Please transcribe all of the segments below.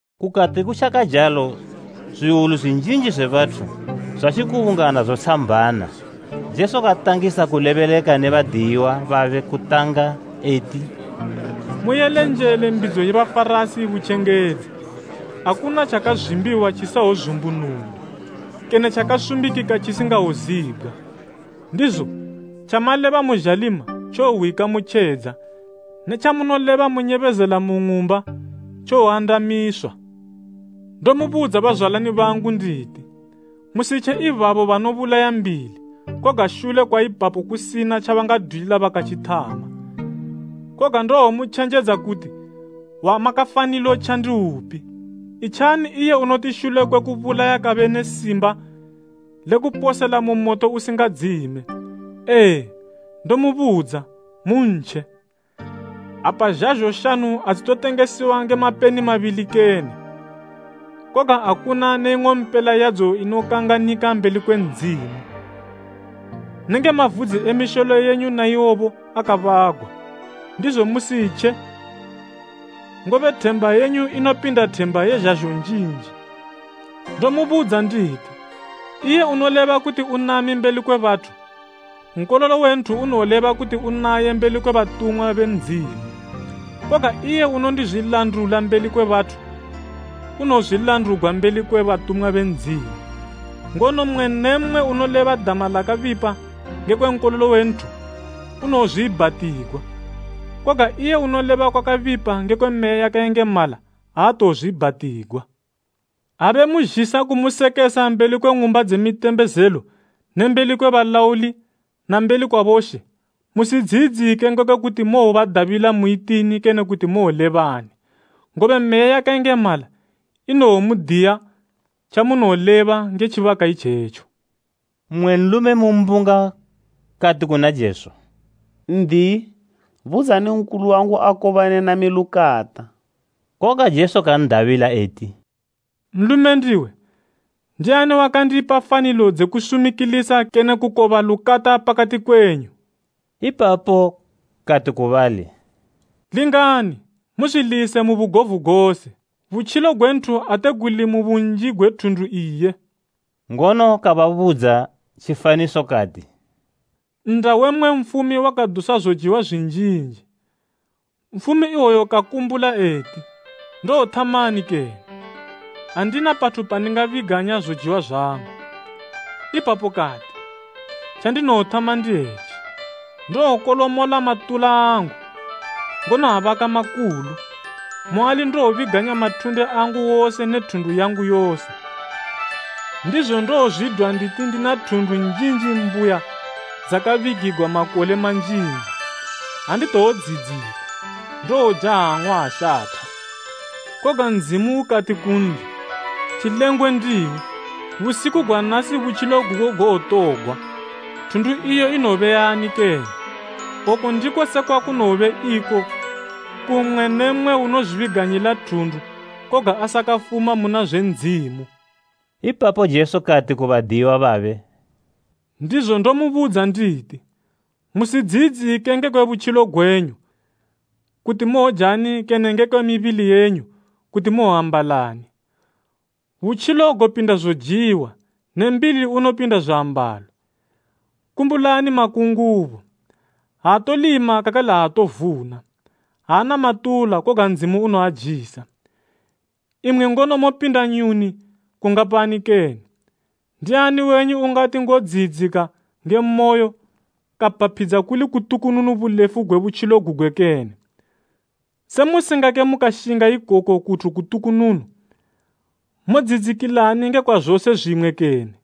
Kukati kutjakajalo zwiwulu zwinjinji zwe bathu, zwatjikubungana zotshambana, Jesu katangisa kulebeleka ne badiyiwa babe kutanga eti, “Muyele njele mbidzo ye Bafarasi butjengedzi. Akuna tjakazwimbiwa tjisingawozumbunugwa, kene tjakasumbikika tjisingawozibgwa. Ndizo tjamaleba mu zhalima tjowohwika mu tjedza ne tjamunoleba munyebezela mu ng'umba, tjowoandamisiwa.” “Ndomubudza bazwalani bangu nditi, musitje ibabo banobulaya mbili, koga shule kwa ipapo kusina tjabangadwilila bakatjithama. Koga ndowomutjenjedza kuti wamakafanilo tja ndiupi. Itjani iye unoti shule kwe kubulaya kabe ne simba lekuposela mu moto usingadzime. Ee, ndomubudza, muntje. “Apa zhazho shanu adzitotengesiwa nge mapeni mabili kene? Koga akuna ne ing'ompela yadzo inokanganika mbeli kwe Ndzimu. Nenge mavudzi e misholo yenyu na iwobo akabagwa. Ndizo musitje ngobe themba yenyu inopida themba ye zhazho njinji.” “Ndomubudza nditi, iye unoleba kuti unami mbeli kwe bathu, Nkololo we Nthu unoleba kuti unaye mbeli kwe batumwa be Ndzimu. Koga iye unondizwilandula mbeli kwe bathu unowozwilandugwa mbeli kwe batumwa be Ndzimu. “Ngono mmwe ne mmwe unoleba dama lakabipa ngekwe Nkololo we Nthu unowozwiibhatigwa, koga iye unoleba kwakabipa ngekwe Meya yakayengemala aatowozwiibhatigwa. “Ha bemuzhisa kumusekesa mbeli kwe ng'umba dze mitembezelo ne mbeli kwe balauli na mbeli kwa boshe, musidziyidzike ngekwe kuti mowodabila muitini kene kuti mowolebani, ngobe Meya yakayengemala inowomudiya tjamunowoleba nge tjibaka itjetjo.” Mmwe nlume mu mbunga kati kuna Jesu, “N'diyi, budzani nkulu wangu akobane nami lukata.” Koga Jesu kan'dabila eti, “Nlume ndiwe, ndiani wakandipa fanilo dze kusumikilisa kene kukoba lukata pakati kwenyu!” Ipapo kati ku bali, “Lingani! Muzwilise mu bugovu gose, butjilo gwe nthu ate guli mu bunji gwe thundu iye.” Ngono kababudza tjifaniso kati, “Nnda we mmwe nfumi wakadusa zojiwa zwinjinji. Nfumi iwoyo kakumbula eti, ‘Ndowothamani kene? Andina pathu pandingabiganya zojiwa zwangu.’ Ipapo kati, ‘Tjandinowothama ndi etji: Ndowokolomola matula angu, ngono abaka makulu, muali ndowobiganya mathunde angu wose ne thundu yangu yose. Ndizo ndowozwidwa nditi ndina thundu njinji mbuya dzakabigigwa makole manjinji. Anditowodziyidzika, ndowoja ang'wa ashatha.’ Koga Ndzimu ukati kunli, ‘Tjilengwe ndiwe, busiku gwa nasi butjilo gugo gowotogwa. Thundu iyo inowobe yani kene?’ Oku ndiko sekwa kunowobe iko ku mmwe ne mmwe unozwibiganyila thundu koga asakafuma muna zwe Ndzimu.” Ipapo Jesu kati ku badiyiwa babe, “Ndizo ndomubudza nditi, musidziyidzike ngekwe butjilo gwenyu, kuti mowojani kene ngekwe mibili yenyu, kuti mowoambalani. Butjilo gopinda zojiwa ne mbili unopinda zwiambalo. Kumbulani makungubo, aatodzwala kakale aatovuna, aana matula koga Ndzimu unoajisa. Imwi ngono mopinda nyuni kungapani kene! Ndiani wenyu ungati ngodziyidzika nge moyo, kapaphidza kuli kutukununu bulefu gwe butjilo gugwe kene? Se musingake mukashinga ikoku kuthu kutukununu, modziyidzikilani ngekwa zose zwimwe kene?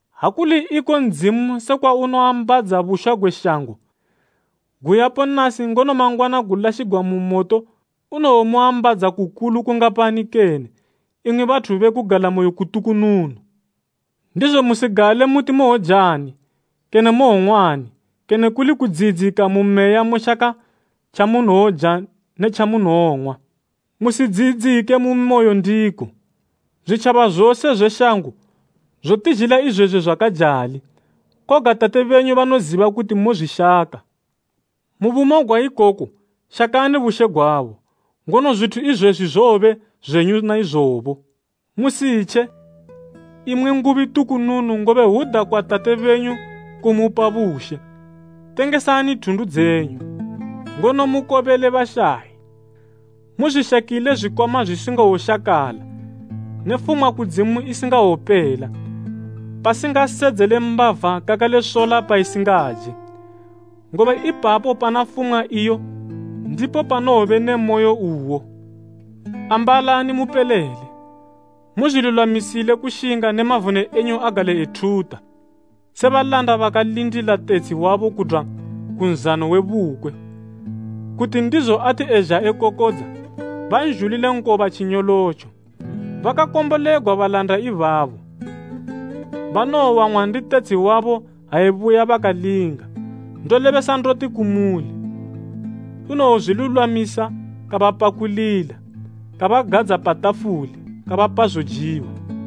Ha kuli iko Ndzimu sekwa unoambadza bushwa gwe shango, guyapo nasi ngono mangwana gulashigwa mu moto, unowomuambadza kukulu kungapani kene, imwi bathu be kugalamoyo kutukununu! “Ndizo musigale muti mowojani kene mowong'wani kene kuli kudziyidzika mu meya mushaka tjamunowoja ne tjamonowong'wa. Musidziyidzike mu mimoyo ndiko. Zwitjaba zose zwe shango zotizhilila izwezwi zwakajali, koga Tate benyu banoziba kuti mozwishaka. Mu bumo gwa ikoku shakani bushe gwabo, ngono zwithu izwezwi zowobe zwenyu naizobo.” “Musitje, imwi ngubi tukununu ngobe hwuda kwa Tate benyu kumupa bushe. Tengesani thundu dzenyu, ngono mukobele bashayi. Muzwishakile zwikwama zwisingawoshakala ne fumwa kudzimu isingawopela, pasingasedzele mbava kakale sola paisingaje. Ipapo pana fumwa yenyu, ndipo panowobe ne mimoyo yenyubo. “Ambalani mupelele, muzwilulwamisile kushinga ne mavone enyu agale ethuta, se balanda bakalindila tetshi wabo kudwa ku nzano we bukwe, kuti ndizo ati ezha ekokodza, banzhulile nkoba tjinyolotjo. Bakakombolegwa balanda ibabo banowowang'wa ndi tetshi wabo ha ebuya bakalinga. Ndolebesa ndoti kumuli, unowozwilulwamisa kabapakulila, kabagadza pa tafuli, kabapa zojiwa.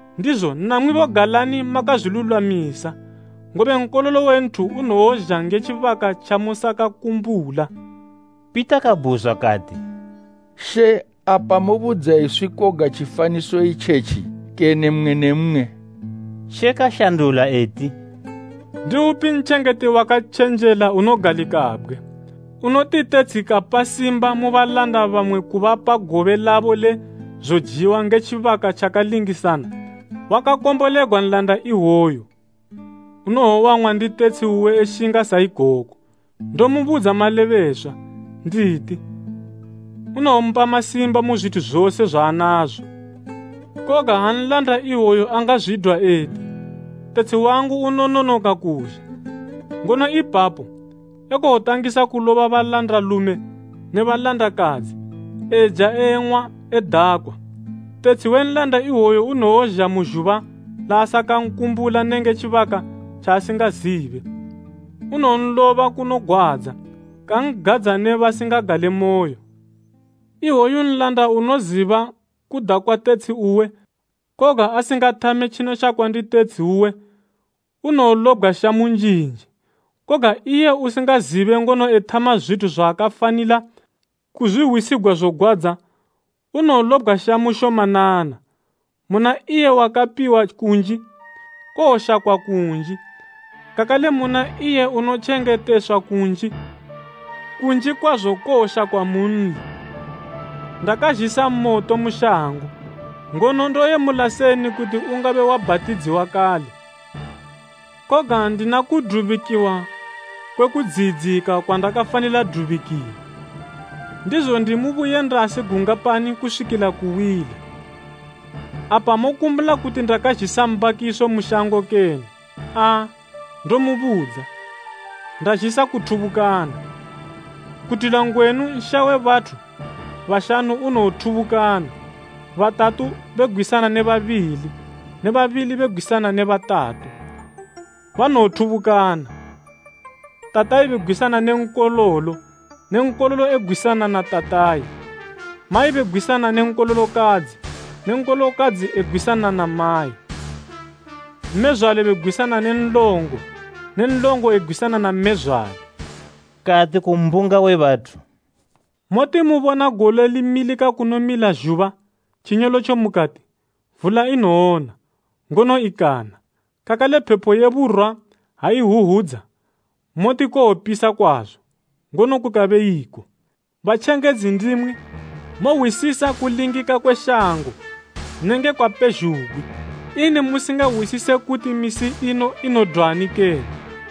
Ndizo namwibo galani makazwilulwamisa, ngobe Nkololo we Nthu unowozha nge tjibaka tjamusakankumbula.” Pita kabhuzwa kati, “She, apa mobudza iswi koga tjifaniso itjetji, kene mmwe ne mmwe?” She kashandula eti, “Ndiupi ntjengeti wakatjenjela unogalikabgwe, unoti tetshi kampa simba mu balanda bamwe kupa balanda gobe labo le zojiwa nge tjibaka tjakalingisana? Wakakombolegwa nlanda iwoyo unowowang'wa ndi tetshi uwe eshinga sa ikoko. Ndomubudza malebeswa, nditi, unowompa masimba mu zwithu zose zwaanazo. Koga ha nlanda iwoyu angazwidwa eti, ‘Tetshi wangu unononoka kuzha,’ ngono ipapo ekowotangisa kuloba balandalume ne balandakadzi, eja eng'wa edakwa, tetshi we nlanda iwoyo unowozha mu zhuba laasakankumbula nenge tjibaka tjaasingazibe. Unowonloba kunogwadza kan'gadza ne basingagalemoyo. “Iwoyo nlanda unoziba kuda kwa tetshi uwe koga asingathame tjinoshakwa ndi tetshi uwe, unowolobgwa shamu njinji. Koga iye usingazibe ngono ethama zwithu zwaakafanila hwisigwa zogwadza, unowolobgwa shamu shomanana. Muna iye wakapiwa kunji, kowoshakwa kunji, kakale muna iye unotjengeteswa kunji, kunji kwazo kowoshakwa munli.” “Ndakazhisa moto mu shango, ngono ndoyemula seni kuti ungabe wabhatidziwa kale! Koga ndina kudubikiwa kwe kudziyidzika kwandakafanila dubikiwa, ndizo ndi mu buyendasi gungapani kuswikila kuwila! Apa mokumbula kuti ndazhisa mbakiso mu shango kene? Aa, ndomubudza, ndazhisa kuthubukana. Kudwila ngwenu nsha we bathu bashanu unowothubukana, batatu begwisana ne babili ne babili begwisana ne batatu. Banowothubukana, tatayi begwisana ne nkololo ne nkololo egwisana na tatayi, mayi begwisana ne nkololokadzi ne nkololokadzi egwisana na mayi, mmezwale begwisana ne nlongo ne nlongo egwisana na mmezwale.” Kati ku mbunga we bathu, “Moti mubona gole limilika kunomila zhuba, tjinyolotjo mukati, ‘Vula inowona,’ ngono ikana. Kakale phepo ye Burwa ha ihwuhwudza, moti kowopisa kwazo, ngono kukabe iko. Batjengedzi ndimwi! Mohwisisa kulingika kwe shango ne nge kwa pezhugwi. Ini musingahwisise kuti misi ino inodwani kene?”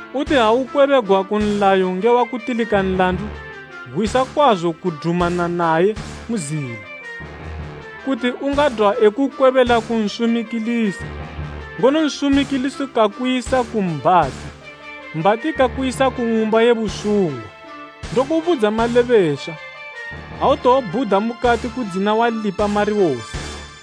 Uti ha ukwebegwa ku nlayo nge wakutilika nlandu, gwisa kwazo kudumana naye mu zila, kuti ungadwa ekukwebela ku nsumikilisi, ngono nsumikilisi kakuyisa ku mbhati, mbhati kakuyisa ku ng'umba ye busungwa. Ndokubudza malebeswa, autowobhuda mukati kudzina walipa mari wose.”